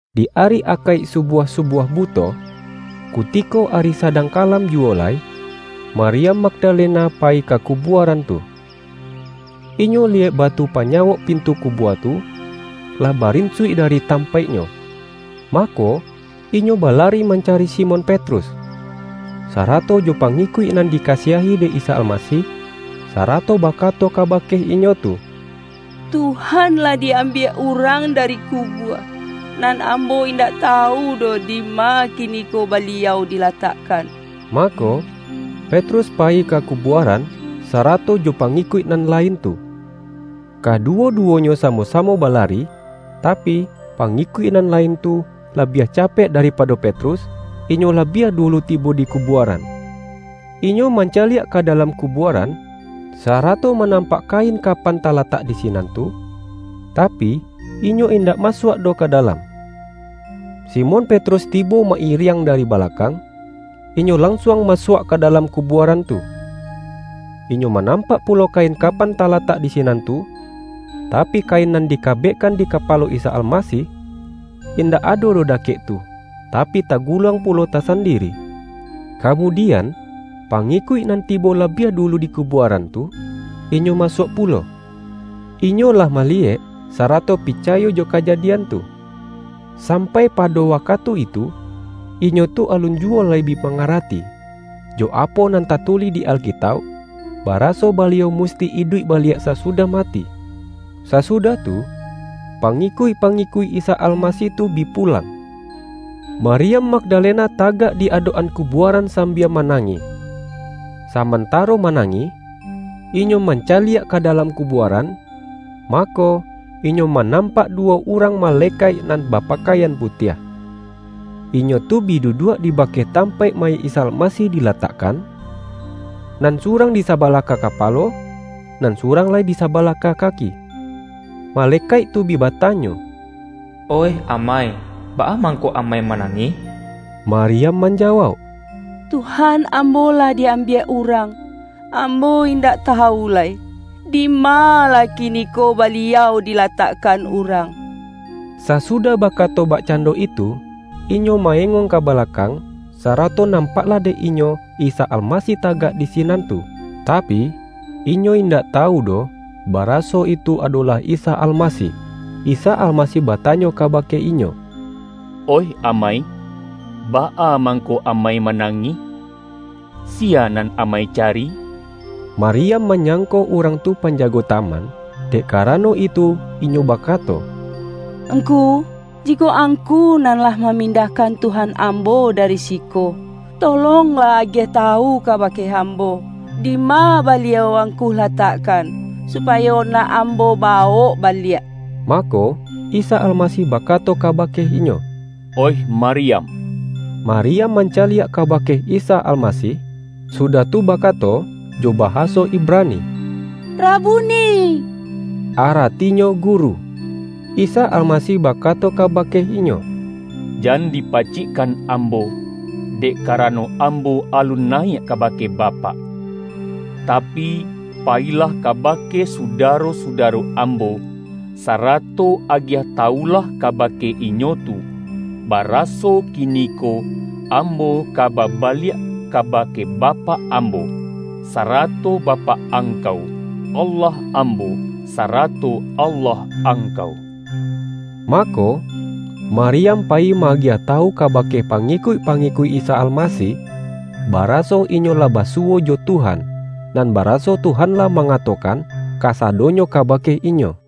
Di ari Akaik subuah-subuah bu-to, kutiko ari sadang kalam ju-wo lai, Maryam Magdalena payi ka ku-buaran tu. Inyo liyek batu panyawok pintu kubua tu, lah barinsuik dari tam-paiknyo. Mako, inyo balari mancari Si-mon Petrus, sarato jo pangikuik nan di-kasiahi dek Isa Almasih, sarato bakato kabake inyo tu,”Tuhan lah di-ambiak urang dari kubua, nan ambo indak tawu doh dima kiniko Baliau dilatakkan.” Mako, Petrus payi ka kubuaran, sa-rato jo pangikuik nan lain tu. Kaduwo-duwonyo samo-samo balari, tapi, pangikuik nan lain tu, labiah capek daripado Petrus, inyo labiah dulu tibo di kubuaran. Inyo mancaliak ka da-lam kubuaran, sarato manampak ka-in kapan talatak di sinan tu, tapi, inyo indak masuak doh ka dalam. Simon Petrus tibo ma-iriang dari balakang, inyo lansuang masuak ka dalam ku-buaran tu. Inyo manampak pulo kain kapan talatak di sinan tu, tapi, kain nan dikabekkan di kapalo Isa Almasih, indak ado doh dakek tu, tapi, taguluang pulo tasandiri. Kamudian, pangikuik nan tibo labiah dulu di kubuaran tu, inyo masuak pulo. Inyo lah maliyek, sarato picayo jo kajadian tu. Sampai pado wakatu itu, inyo tu alun juwo lai bi mangarati, jo apo nan tatulih di Alkitauk, baraso Baliau musti iduik baliak sasudah mati. Sasudah tu, pangikuik-pangikuik Isa Almasih tu bi pulang. Maryam Magdalena tagak di adok-an kubuaran sambia manangih. Sa-mantaro manangih, inyo mancaliak ka dalam kubuaran, m ako, inyo ma-nampak duwo urang malekaik, nan ba-pakaian putiah. Inyo tu bi duduak di bakeh tampaik mayik Isa Almasih di-latakkan, nan surang di sabalah ka ka-palo, nan surang lai di sabalah ka kaki. Malekaik tu bi batanyo,”Oih amai, baa mangko amai manangih?” Maryam manjawauk,”Tuhan ambo lah di-ambiak urang, ambo indak ta-wu lai, dima lah kiniko Baliau dila-takkan urang.” Sasudah bakato bakcando itu, inyo ma-engong ka balakang, sarato nam-paklah dek inyo Isa Almasih tagak di sinan tu. Tapi, inyo indak tawu doh, baraso itu adolah Isa Almasih. Isa Almasih batanyo kabake inyo,”Oih amai, baa mangko amai manangih? Siya nan amai cari?” Maryam manyangko urang tu panja-go taman, dek karano itu inyo bakato,”Ngku, jikok angku nan lah mamin-dahkan Tuhan ambo dari siko, tolong-lah agiah tawu kabake ambo, dima Baliau angku latakkan, supayo nak ambo bawok baliak.” Mako, Isa Almasih bakato kaba-ke inyo,”Oih Maryam!” Maryam mancaliak kabake Isa Almasih, sudah tu bakato jo bahaso Ib-rani,”Rabuni!” (Aratinyo”Guru”.) Isa Almasih bakato kabake inyo,”Jan dipacikkan Ambo, dek karano Ambo alun nayiak kabake Bapak. Tapi, payilah kabake sudaro-sudaro Ambo, sarato agiah tawulah kabake inyo tu, baraso kiniko Ambo ka babaliak kaba-ke Bapak Ambo, sarato Bapak angkau, Allah Ambo, sarato Allah angkau.” Mako, Maryam payi ma-agiah ta-wu kabake pangikuik-pangikuik Isa Almasih, baraso inyo lah basuwo jo Tuhan, nan baraso Tuhan lah manga-tokan kasadonyo kabake inyo.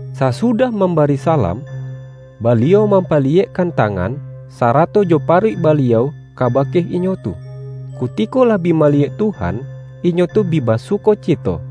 Sasudah mambari salam, Baliau mampaliyekkan tangan, sarato jo pa-ruik Baliau kabake inyo tu. Kutiko lah bi maliyek Tuhan, inyo tu bi basuko-cito.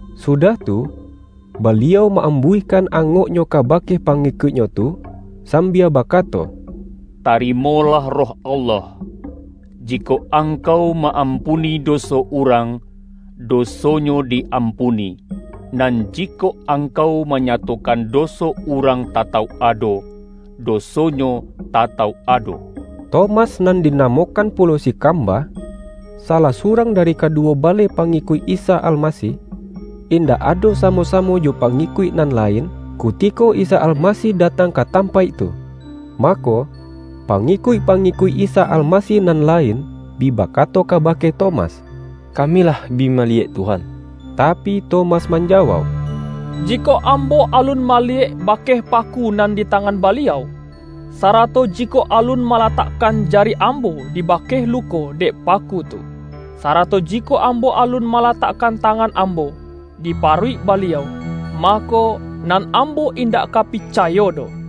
Sudah tu, Baliau ma-am-buihkan angok-Nyo kabake pangikuik-Nyo tu, sambia bakato,”Tarimolah Roh Allah. Jikok angkau ma-ampuni do-so urang, dosonyo di-ampuni, nan ji-kok angkau manyatokan doso urang tatauk ado, dosonyo tatauk ado.” Tomas (nan dinamokan pulo si”Kamba"), salah surang dari kaduwo baleh pangikuik Isa Almasih, indak ado samo-samo jo pangikuik nan la-in, kutiko Isa Almasih datang ka tam-paik tu. Mako, pangikuik-pangi-kuik Isa Almasih nan lain bi bakato kabake Tomas,”Kami lah bi maliyek Tuhan!” Tapi, Tomas manjawauk,”Jikok am-bo alun maliyek bakeh paku nan di tangan Baliau, sarato jikok alun ma-latakkan jari ambo di bakeh luko dek paku tu, sarato jikok ambo alun ma-latakkan tangan ambo, di paruik Ba-liau, mako, nan ambo indak ka pica-yo doh.”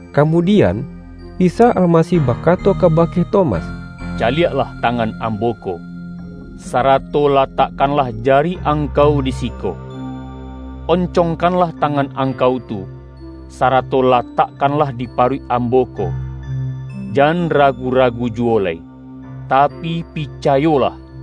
Kamudian, Isa Almasih bakato ka-bake Tomas,”Caliaklah tangan Ambo ko, sarato latakkanlah jari angkau di siko. Oncongkanlah tangan angkau tu, sarato latakkanlah di paruik Am-bo ko. Jan ragu-ragu juwo lai, tapi pi-cayolah!”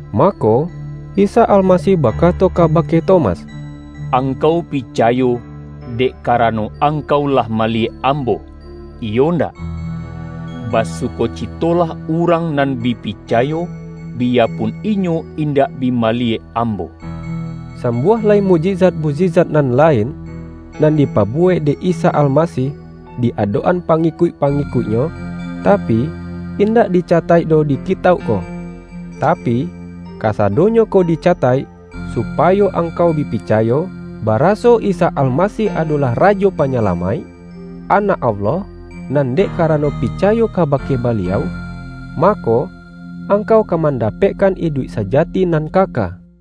Mako, Isa Almasih bakato kaba-ke Tomas,”Angkau picayo, dek ka-rano angkau lah maliyek Ambo, iyo ndak? Basukocitolah urang nan bi picayo, biya pun inyo indak bi maliyek Ambo!” Sambuah lai mukjizat-mukji-zat nan lain, nan dipabuwek dek Isa Almasih di adok-an pangikuik-pangi-kuik-Nyo, tapi, indak dicataik doh di kitauk ko. Tapi, kasadonyo ko dica-taik, supayo angkau bi picayo, baraso Isa Almasih adolah Rajo Panyalamaik, Anak Allah, nan dek karano picayo ka-bake Baliau, mako, angkau ka manda-pekkan iduik sajati nan kaka. YAHYA